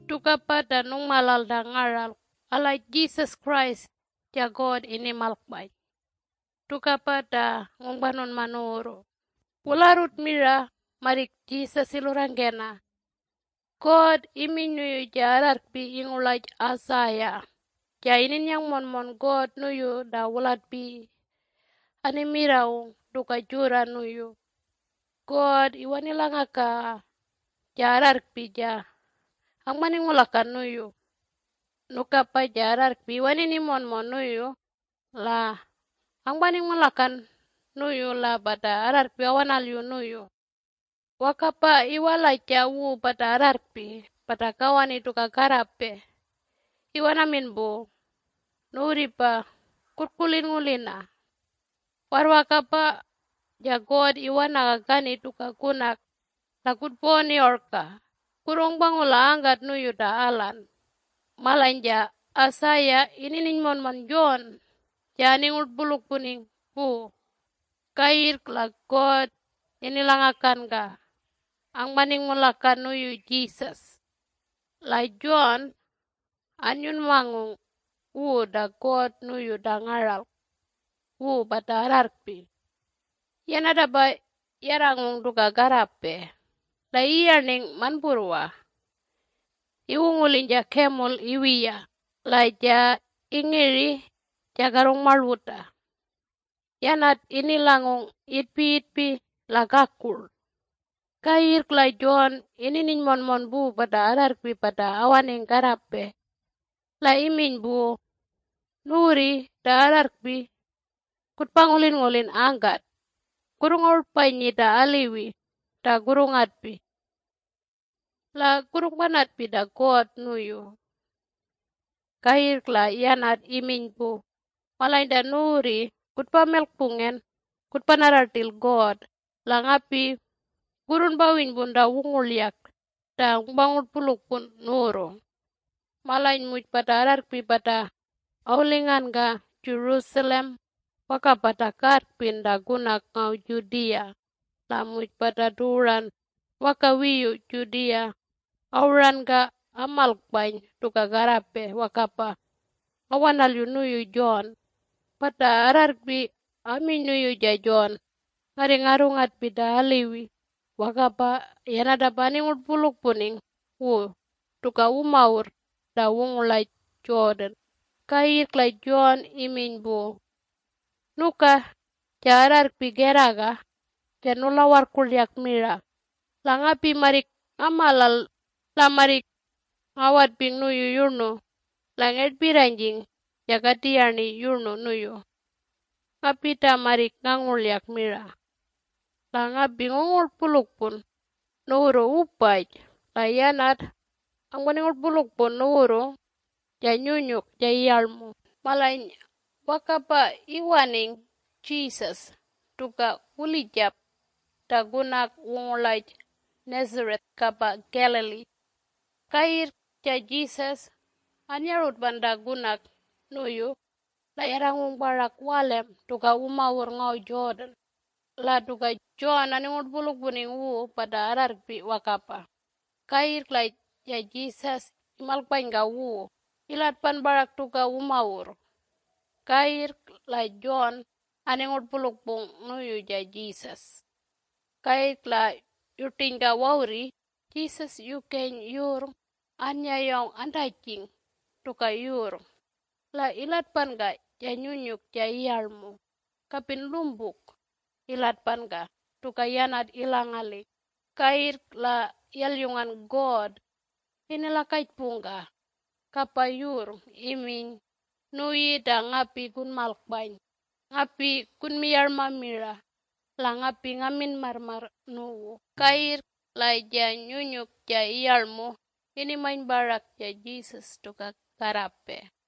Tukapa ta nungmalal ta ngaralk alaj Jesus Christ ja God inimalkpany. Tukapa ta ngungpanunma nuwurru. Wularrut mira marrik Jesus ilurrangkena, God iminy nuyu ja arrarrkpi ingurlaj Isaiah ja inininy monmon God nuyu ta wulatpiyi animirrawung tuka jurra nuyu, “God iwanilangakaga ja arrarrkpi ja angpaningulakan nuyu. Nukapa ja arrarrkpi iwanini monmon nuyu la angpaningulakan nuyu la pata arrarrkpi awanalyu nuyu. Wakapa iwalaja wu pata arrarrkpi pata kawani tuka karrape iwanamin pu, ‘Nuwurripa kurrkulinngulina! Warrwakapa ja God iwanaga kani tuka kunak la kutpawani orka. Kurrungpangula angkat nuyu ta alan.’” Malany ja Isaiah inininy monmon John ja aningurtpulukpuning pu. Kayirrk la God inilangakanka angpaningulakan nuyu Jesus. La John annyunmangung wu ta God nuyu ta ngaralk wu pata arrarrkpi. Yanatapa yarrangung tuka karrapey la iyarning manpurrwa iwunguliny ja camel iwiya la muj iyarning ingiri ja karrungmarluta. Yanat inilangung itpiyitpi la kakurl. Kayirrk la John inininy monmon pu pata arrarrkpi pata awaning karrapey. La iminy pu, “Nuwurri ta arrarrkpi kutpangulingulin angkat, kurrungarutpanyi ta aliwi ta kurrungatpi la kurrungpanatpi ta God nuyu.” Kayirrk la yanat iminy pu, “Malany ta nuwurri kutpamilkpungen kutpanarra rtil God la ngapi kurrunpawinypun ta wungurlyak ta ngungpangurtpulukpun nuwurru.” Malany muj pata ararrkpi pata awulinganka Jerusalem wakapa ta karrpin ta kunak ngaw Judea la muj pata tuwuran waka wiyu Judea awuranka amalkpany tuka karrapey wakapa awanalyu nuyu John. Pata arrarrkpi aminy nuyu ja John, “Ngarri ngarrungatpi ta aliwi.” Wakapa yanatapa aningurtpulukpuning wu tuka wumawurr ta wungurlaj Jordan. Kayirrk la John iminy pu, “Nuka ja arrarrkpi kerraga ja nulawarrkurlyak mira. La ngapi marrik ngamalal la marrik ngawatping nuyu yurnu la ngertpirranyjing ja katiyarni yurnu nuyu. Ngapi ta marrik ngangurlyak mira. La ngapi ngungurtpulukpun nuwurru wupaj la yanat angpaningurtpulukpun nuwurru ja Nyunyuk ja Iyarlmu.” Malany wakapa iwaning Jesus tuka wulijap ta kunak wungurlaj Nazareth kapa Galilee. Kayirrk ja Jesus annyarutpan ta kunak nuyu la yarrangung parak walem tuka wumawurr ngaw Jordan. La tuka John aningurtpulukpuning wu pata arrarrkpi wakapa. Kayirrk la ja Jesus imalkpanyka wu ilatpan parak tuka wumawurr kayirrk la John aningurtpulukpung nuyu ja Jesus. Kayirrk la yurtinyka wawurri Jesus yukeny yurrng annyayawng antajing tuka yurrng la ilatpanka ja Nyunyuk ja Iyarlmu kapin rlumpuk ilatpanka tuka yanat ilangaling. Kayirrk la yalyungan God inilakajpungka kapa yurrng iminy, “Nuyi ta ngapi kunmalkpany. Ngapi kunmiyarma mira la ngapi ngamin marrmarr nuwu.” Kayirrk la ja Nyunyuk ja Iyarlmu inimany parak ja Jesus tuka karrapey.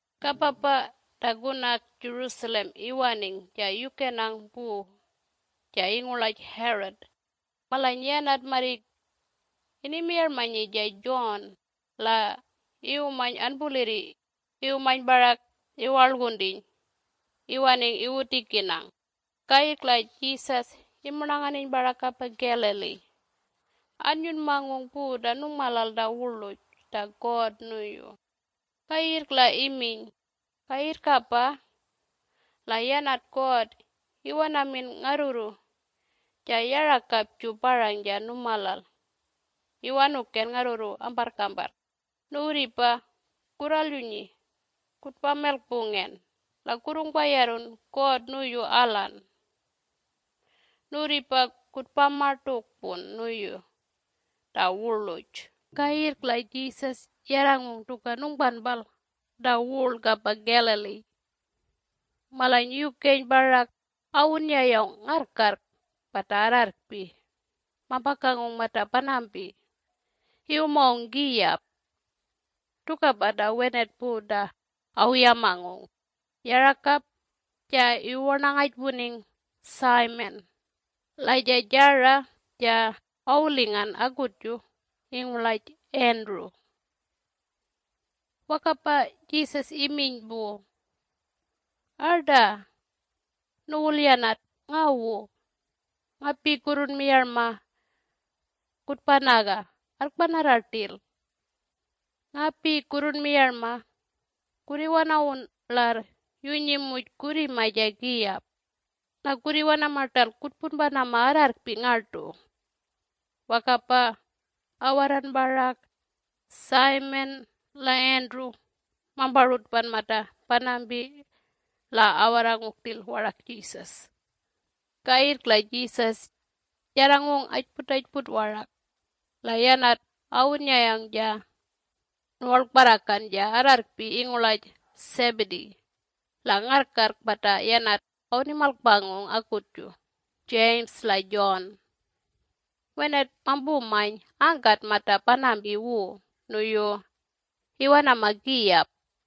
Kapapa ta kunak Jerusalem iwaning ja yukenang pu ja ingurlaj Herod. Malany yanat marrik inimiyarmanyi ja John la iwumany anpulirri iwumany parak iwarlguntiny iwaning iwutikinang. Kayirrk la Jesus imurnanganiny parak kapa Galilee annyunmangung pu ta nungmalal ta wurluj ta God nuyu. Kayirrk la iminy, “Kayirrkapa la yanat God iwanamin ngarrurru ja yarakapju parang ja numalal Iwanuken ngarrurru amparrkamparrk. Nuwurripa kurralyunyi kutpamilkpungen la kurrungpayarrun God nuyu alan. Nuwurripa kutpamartukpun nuyu ta wurluj!” Kayirrk la Jesus yarrangung tuka nungpanpal ta wurl kapa Galilee. Malany yukeny parak awunnyayawng ngarrkarrk pata arrarrkpi mampakangung mata panampi iwumangung kiyap. Tukapa ta wenat pu ta awuyamangung. Yarakap ja iwuwarnangajpuning Simon la ja jara ja awulingan akutju ingurlaj Andrew. Wakapa Jesus iminy pu, “Arta, nuwulyanat, ngawu! Ngapi kurrunmiyarma kutpanaga arrkpanarra rtil. Ngapi kurrunmiyarma kurriwanawun larr yunyi muj kurrima ja kiyap la kurriwanama rtalk kutpunpanama arrarrkpi ngartu.” Wakapa awarran parak Simon la Andrew mamparutpan mata panampi la awarrangung rtil warak Jesus. Kayirrk la Jesus yarrangung ajputajput warak la yanat awunnyayawng ja nuwarlkparrakan ja arrarrkpi ingurlaj Zebedee la ngarrkarrk pata yanat awunimalkpangung akutju James la John. Wenat mampumany angkat mata panampi wu nuyu iwanama kiyap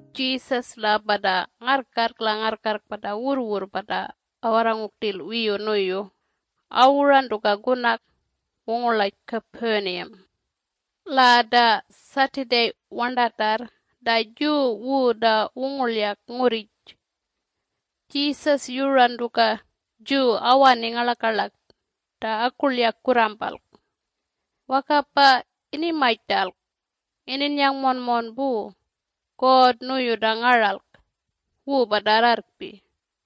Jesus la pata ngarrkarrk la ngarrkarrk pata wurrwurr pata awarrangung rtil wiyu nuyu awuran tuka kunak wungurlaj Capernaum. La ta Saturday warntatarr ta Jew wu ta wungurlyak ngurrij, Jesus yuran tuka Jew awaning ngarlakarlak ta akurlyak kurrumpalk wakapa inimany rtalk ininnyang monmon pu God nuyu ta ngaralk wu pata arrarrkpi.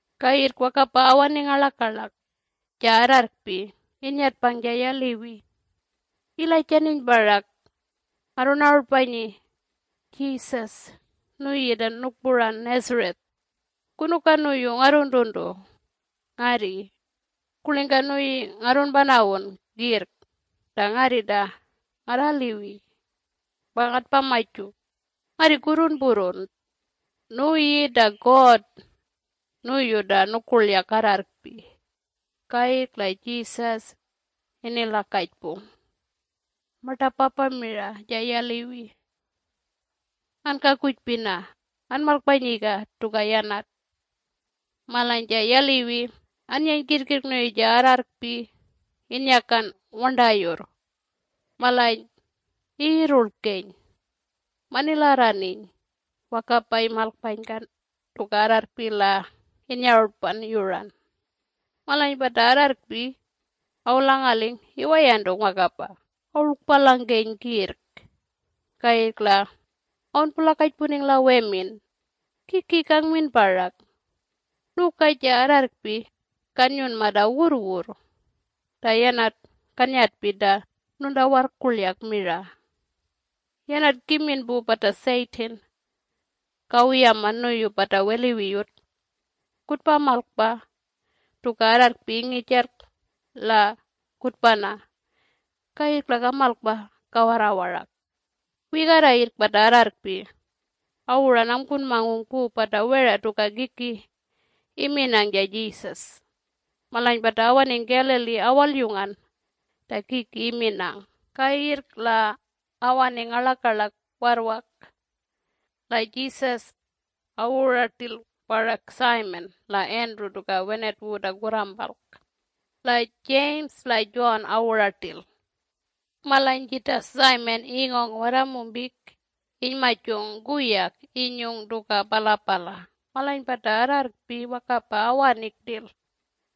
Kayirrk wakapa awaning ngarlakarlak, ja arrarrkpi innyatpang ja yaliwi ilajantiny parak, “Ngarrunarutpanyi, Jesus nuyi ta nukpuran Nazareth. Kunuka nuyu ngarruntuntu ngarri? Kurlingka nuyi ngarrunpanawun kirrk ta ngarri ta ngarraliwi pa ngatpamaju? Ngarri kurrunpurrun! Nuyi ta God nuyu ta nukurlyak arrarrkpi!” Kayirrk la Jesus inilakajpung martapapa mira ja yaliwi “Ankakujpina! Anmalkpanyiga tuka yanat.” Malany ja yaliwi annyeny kirrkirrk nuyu ja arrarrkpi innyakan warntayurr. Malany iyirrurlkeny manilarraniny wakapa imalkpanyka tuka arrarrkpi la innyarutpan yuran. Malany pata arrarrkpi awulangaling iwayantung wakapa awurlkpalangkeny kirrk. Kayirrk la awunpulakajpuning la wemin, “Kiki kangmin parak? Nuka ja arrarrkpi kanyunma ta wurrwurr ta yanat kannyatpi ta nuntawarrkurlyak mira! Yanat kimin pu pata Satan kawuyama nuyu pata weliwiyut ‘Kutpamalkpa tuka arrarrkpi ingijalk la kutpana’ kayirrk la kamalkpa kawarra warak.” Wigarra yirrk pata arrarrkpi awuran angpunmangung pu pata wera tuka kiki iminang ja Jesus. Malany pata awaning Galilee awalyungan ta kiki iminang. Kayirrk la awaningan ngarlakarlak warrwak la Jesus awuran rtil warak Simon la Andrew tuka wenat wu ta kurrampalk. La James la John awuran rtil. Malany jita Simon ingawng waramumpik inymajung kuyak inyung tuka palapala. Malany pata arrarrkpi wakapa awaning rtil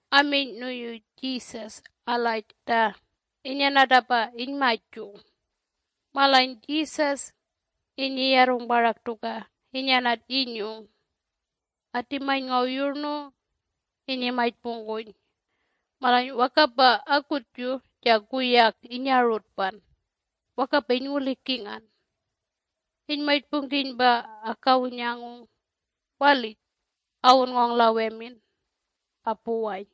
aminy nuyu Jesus alaj ta inyanatapa inymajung. Malany Jesus innyiyarrung parak tuka inyanat innyung atimany ngaw yurnu innyimajpungkuny. Malany wakapa akutju ja kuyak innyarutpan wakapa inyngulikingan. Inymajpungkiny pa akawunyangung walij awunngawng la wemin apuwany.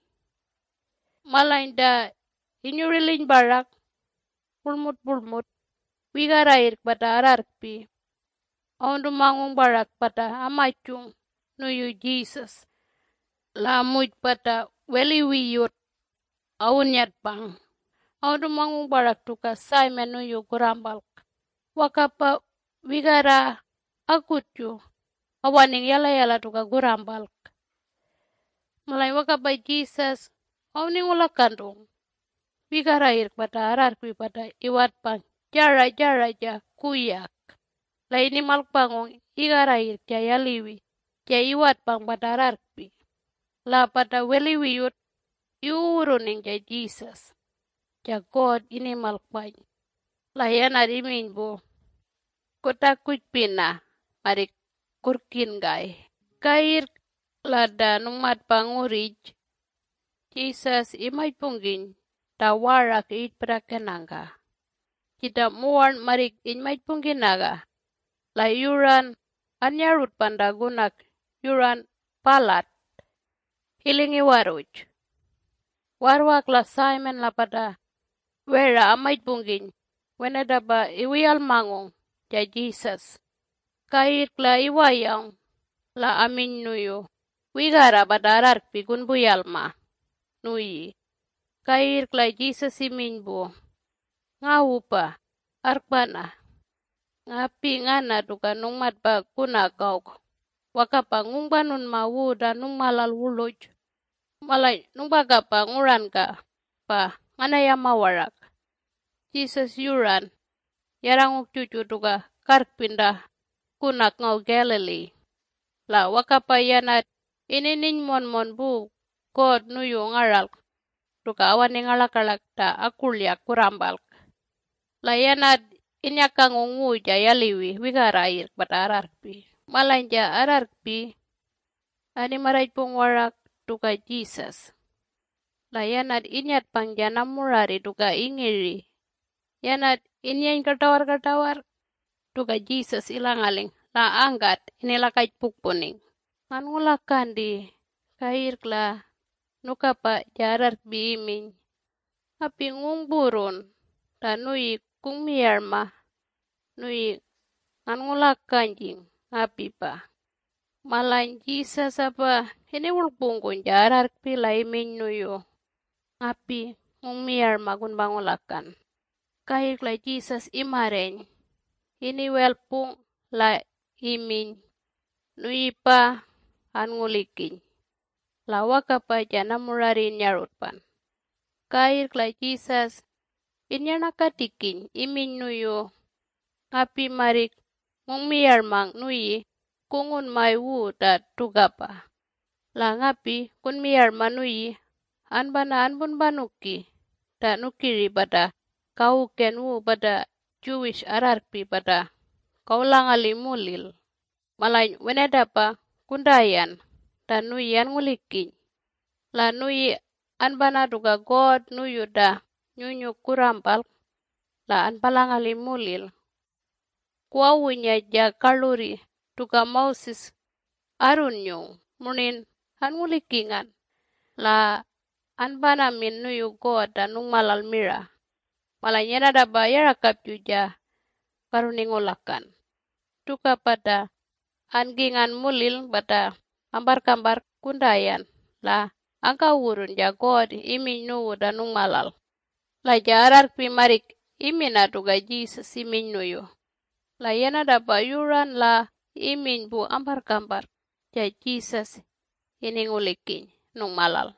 Malany ta inyuriliny parak wurlmupurlmut wigarra yirrk pata arrarrkpi awuntumangung parak pata amajunmajung nuyu Jesus la muj pata weliwiyut awunnyatpang awuntumangung parak tuka Simon nuyu kurrampalk. Wakapa wigarra akutju awaning yalayala tuka kurrampalk. Malany wakapa Jesus awuningulakantung wigarra yirrk pata arrarrkpi pata iwatpang jara jara ja kuyak. La inimalkpangung igarra yirrk ja yaliwi ja iwatpang pata arrarrkpi. La pata weliwiyut iwuwurruning ja Jesus ja God inimalkpany, la yanat iminy pu, “Kutakujpina marrik kurrkinkay!” Kayirrk la ta nungmatpa ngurrij Jesus imajpungkiny ta warak iyirtpirrakenangka, jita muwarn marrik inymajpungkinaga la yuran anyarutpan ta kunak yuran palat iling iwarruj. Warrwak la Simon la pata wera amajpungkiny wenatapa iwuyalmangung ja Jesus. Kayirrk la iwayawng la aminy nuyu, “Wigarra pata arrarrkpi kunpuyalma nuyi.” Kayirrk la Jesus iminy pu, “Ngawupa, arrkpana! Ngapi ngana tuka nungmatpa kunak awk wakapa ngungpanunma wu ta nungmalal wurluj. Malany nungpakapa nguranka pa nganayama warak.” Jesus yuran yarrangung juju tuka karrpin ta kunak ngaw Galilee. La wakapa yanat inininy monmon pu God nuyu ngaralk tuka awaning ngarlakarlak ta akurlyak kurrampalk. La yanat innyakangung wu ja yaliwi wigarra yirrk pata arrarrkpi. Malany ja arrarrkpi animarrajpung warak tuka Jesus. La yanat innyatpang ja namurarri tuka ingiri. Yanat innyeny kartawarrkartawarr tuka Jesus ilangaling la angkat inilakajpukpuning, “Nganngulakanti!” Kayirrk la nukapa ja arrarrkpi iminy, “Ngapi ngungpurrun ta nuyi kungmiyarmang, nuyi nganngulajanyjing ngapipa.” Malany Jesus apa iniwurlkpungkuny ja arrarrkpi la iminy nuyu, “Ngapi ngungmiyarma kunpangulakan.” Kayirrk la Jesus imarreny iniwelkpung la iminy, “Nuyipa anngulikiny!” La wakapa ja namurarri innyarutpan. Kayirrk la Jesus inyarnangkatikiny iminy nuyu, “Ngapi marrik ngungmiyarmang nuyi kungunmay wu ta tukapa! La ngapi kunmiyarma nuyi anpana anpunpanuki ta nukiri pata kawuken wu pata Jewish arrarrkpi pata kawulangali mulil. Malany wenatapa kuntayan ta nuyi anngulikiny. La nuyi anpana tuka God nuyu ta nyunyuk kurrampalk la anpalangali mulil kuwawunya ja karlurri tuka Moses arrunyung murnin anngulikingan, la anpanamin nuyu God ta nungmalal mira. Malany yanatapa yarakapju ja karruningulakan. Tukapa ta ankingan mulil, pata amparrkamparr kuntayan la angkawurrun ja God iminy nuwu ta nungmalal.” La ja arrarrkpi marrik imina tuka Jesus iminy nuyu. La yanatapa yuran la iminy pu amparrkamparr ja Jesus iningulikiny nungmalal.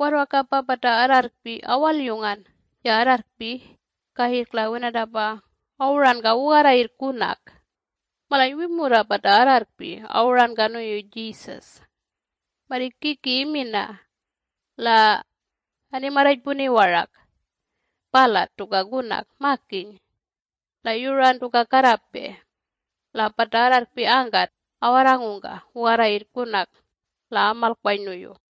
Warrwak apa pata arrarrkpi awalyungan ja arrarrkpi kayirrk la wenatapa awuranka wugarra yirrk kunak. Malany wimurra pata arrarrkpi awuranka nuyu Jesus marrik kiki imina la animarrajpuni warak palat tuka kunak makiny la yuran tuka karrapey. La pata arrarrkpi angkat awarrangungka wugarra yirrk kunak la amalkpany nuyu.